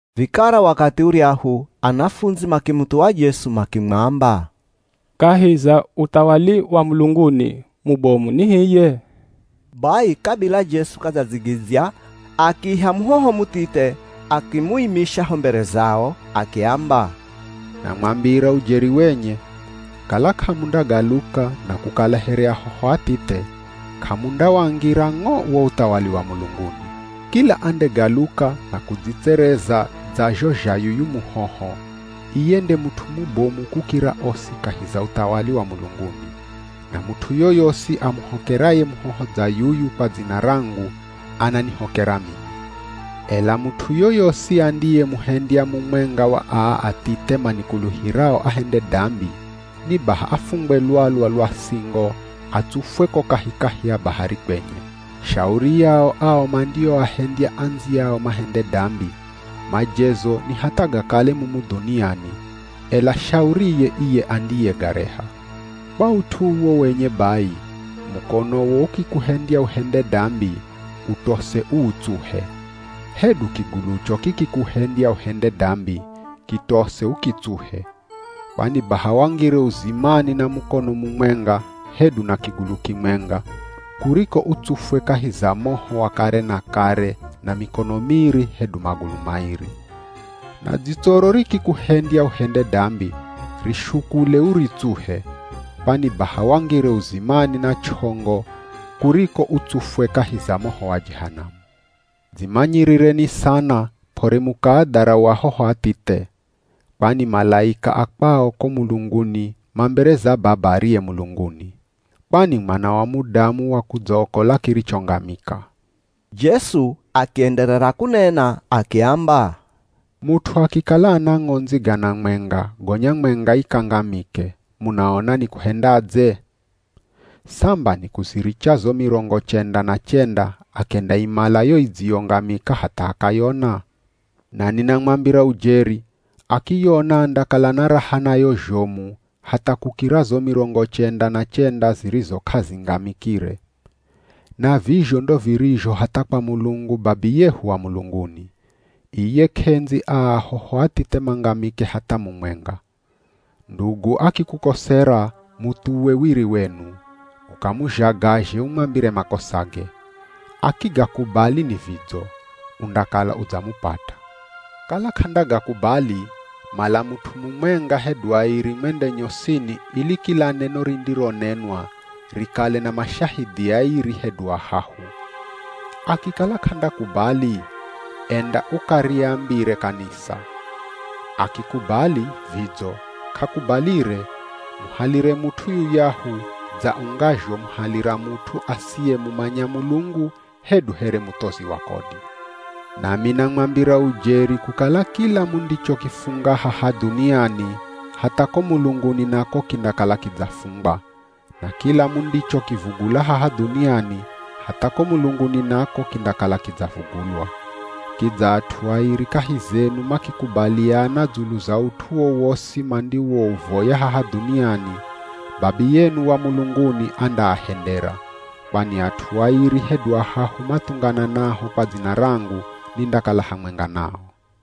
Vikara wakathi uryahu, anafundzi makimuthuwa Jesu makimwamba, “Kahi za uthawali wa mulunguni mubomu ni hiye?” Bai kabila Jesu k'adzadzigidzya, akiiha muhoho muthithe akimuimisha ho mbere zao. Akiamba, “Namwambira ujeri wenye, kala k'amundagaluka na kukala here ahoho athithe, k'amundawangira ng'o wo uthawali wa mulunguni. Kila andegaluka na kudzitsereza dza zho zha yuyu muhoho, iye nde mut'u mubomu kukira osi kahi za uthawali wa mulunguni. Na mut'u yoyosi amuhokeraye muhoho dza yuyu kwa dzina rangu ananihokera mimi.” “Ela mut'u yoyosi andiyemuhendya mumwenga wa aa athithe manikuluhirao ahende dambi, ni baha afungwe lwalwa lwa singo atsufwe ko kahikahi ya bahari kwenye. “Shauri yao ao mandioahendya andziyao mahende dambi. Majezo ni hatha gakale mumu dhuniani, ela shauriye iye andiyegareha. Kwa ut'u uwo wenye bai, mukonowo ukikuhendya uhende dambi, utose uutsuhe. Hedu kigulucho kikikuhendya uhende dambi, kitose ukitsuhe. Kwani baha wangire uzimani na mukono mumwenga hedu na kigulu kimwenga, kuriko utsufwe kahi za moho wa kare na kare na mikono miri hedu magulu mairi. Na dzitsoro rikikuhendya uhende dambi, rishukule uritsuhe. Kwani baha wangire uzimani na ch'ongo kuriko utsufwe kahi za moho wa Jehanamu. “Dzimanyirireni sana p'ore mukaadharau ahoho athithe, kwani malaika a kwao ko mulunguni ma mbere za Baba ariye mulunguni.” [ Kwani Mwana wa Mudamu wakudzaokola kirichongamika.] Jesu akienderera kunena akiamba, “Mut'u akikala ana ng'ondzi gana mwenga gonya mwenga ikangamike, munaona nikuhendadze? Samba nikuziricha zo mirongo chenda na chenda akendaimala yo idziyongamika hatha akayona? Na ninamwambira ujeri, akiyona andakala na raha nayo zhomu hatha kukira zo mirongo chenda na chenda zirizo k'azingamikire. Na vizho ndo virizho hatha kwa Mulungu Babiyehu wa mulunguni. Iye, k'endzi aa ahoho athithe mangamike hatha mumwenga.” “Ndugu akikukosera, muthuwe wiri wenu, ukamuzhagazhe umwambire makosage. Akigakubali ni vidzo, undakala udzamupata. Kala k'andagakubali, mala mut'u mumwenga hedu airi mwende nyosini ili kila neno rindironenwa rikale na mashahidhi airi hedu ahahu. Akikala k'andakubali, enda ukariambire kanisa. Akikubali, vidzo, k'akubalire, muhalire mut'u yuyahu dza ungazhomuhalira mut'u asiyemumanya Mulungu hedu here muthozi wa kodi. Nami namwambira ujeri kukala kila mundichokifunga haha dhuniani hatha ko mulunguni nako kindakala kidzafungwa, na kila mundichokivugula haha dhuniani hatha ko mulunguni nako kindakala kidzavugulwa. Kidza at'u airi kahi zenu makikubaliana dzulu za ut'u wowosi mandiwouvoya haha dhuniani, Babiyenu wa mulunguni andaahendera. Kwani at'u airi hedu ahahu mathungananaho kwa dzina rangu nindakala hamwenga nao.”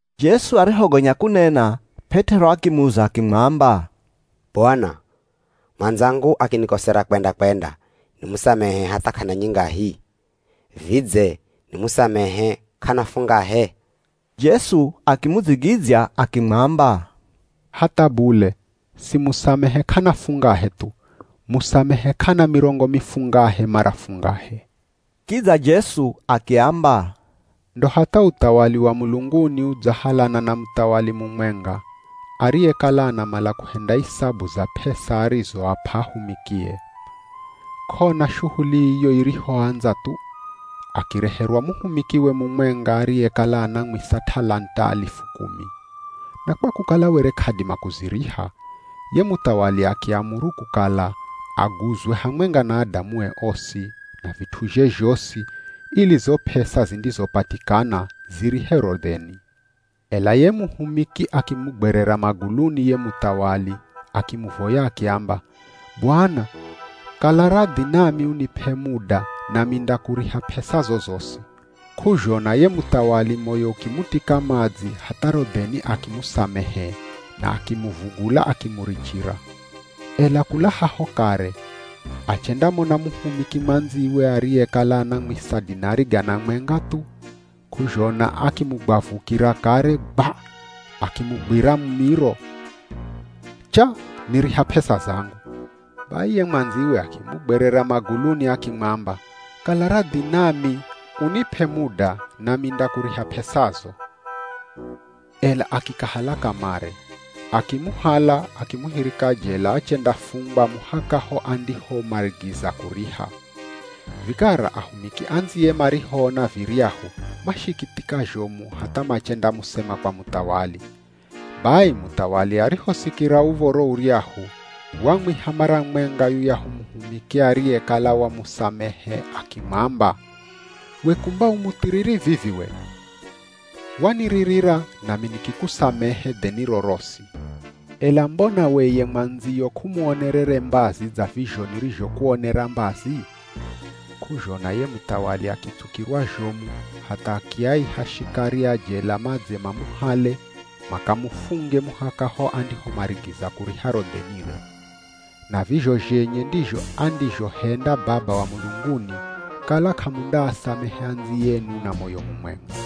Jesu arihogonya kunena, P'et'ero akimuza akimwamba, “Bwana, mwandzangu akinikosera kwenda-kwenda, nimusamehe hatha k'ana nyingahi? Vidze nimusamehe k'ana fungahe?” Jesu akimudzigidzya akimwamba, “Hatha bule, simusamehe k'ana fungahe thu, musamehe k'ana mirongo mifungahe mara fungahe.” Kidza Jesu akiamba, “Ndo hatha uthawali wa mulunguni udzahalana na muthawali mumwenga ariyekala anamala kuhenda isabu za p'esa arizoap'a ahumikie. K'ona shuhuli iyo irihoandza thu, akireherwa muhumikiwe mumwenga ariyekala anamwisa t'alant'a alifu kumi. Na kwa kukala were k'adima kuziriha, ye muthawali akiamuru kukala aguzwe hamwenga na adamue osi, na vit'uzhe zhosi, ili zo p'esa zindizopatikana zirihe ro dheni. Ela ye muhumiki akimugwerera maguluni ye muthawali, akimuvoya akiamba, ‘Bwana, kala radhi nami unip'e muda nami ndakuriha p'esazo zosi.’ K'uzhona ye muthawali moyo ukimutika madzi hatha ro dheni akimusamehe, na akimuvugula akimurichira. Ela kula haho kare, achendamona muhumiki mwandziwe ariyekala anamwisa dinari gana mwenga thu. K'uzhona akimugwavukira kare, gwa, akimugwira mumiro. Cha ‘Niriha p'esa zangu.’ Bai ye mwandziwe akimugwerera maguluni akimwamba, ‘Kala radhi nami unip'e muda nami ndakuriha p'esazo,’ ela akikahala kamare. Akimuhala akimuhirika jela achendafungwa muhaka ho andihomarigiza kuriha. Vikara ahumiki andziye marihoona viryahu mashikithika zhomu hatha machendamusema kwa muthawali. Bai, muthawali arihosikira uv̱oro uryahu, wamwiha mara mwenga yuyahu muhumiki ariyekala wamusamehe akimwamba, ‘We kumba u muthiriri vivi we! Waniririra nami nikikusamehe dheniro rosi, ela mbona we ye mwandziyo k'umuonerere mbazi dza vizho nirizhokuonera mbazi?’ K'uzhona ye muthawali akitsukirwa zhomu hatha akiaiha shikari a jela madze mamuhale makamufunge muhaka ho andihomarigiza kuriha ro dhenire. Na vizho zhenye ndizho andizhohenda Baba wa mulunguni, kala k'amundaasamehe andziyenu na moyo mumwenga.”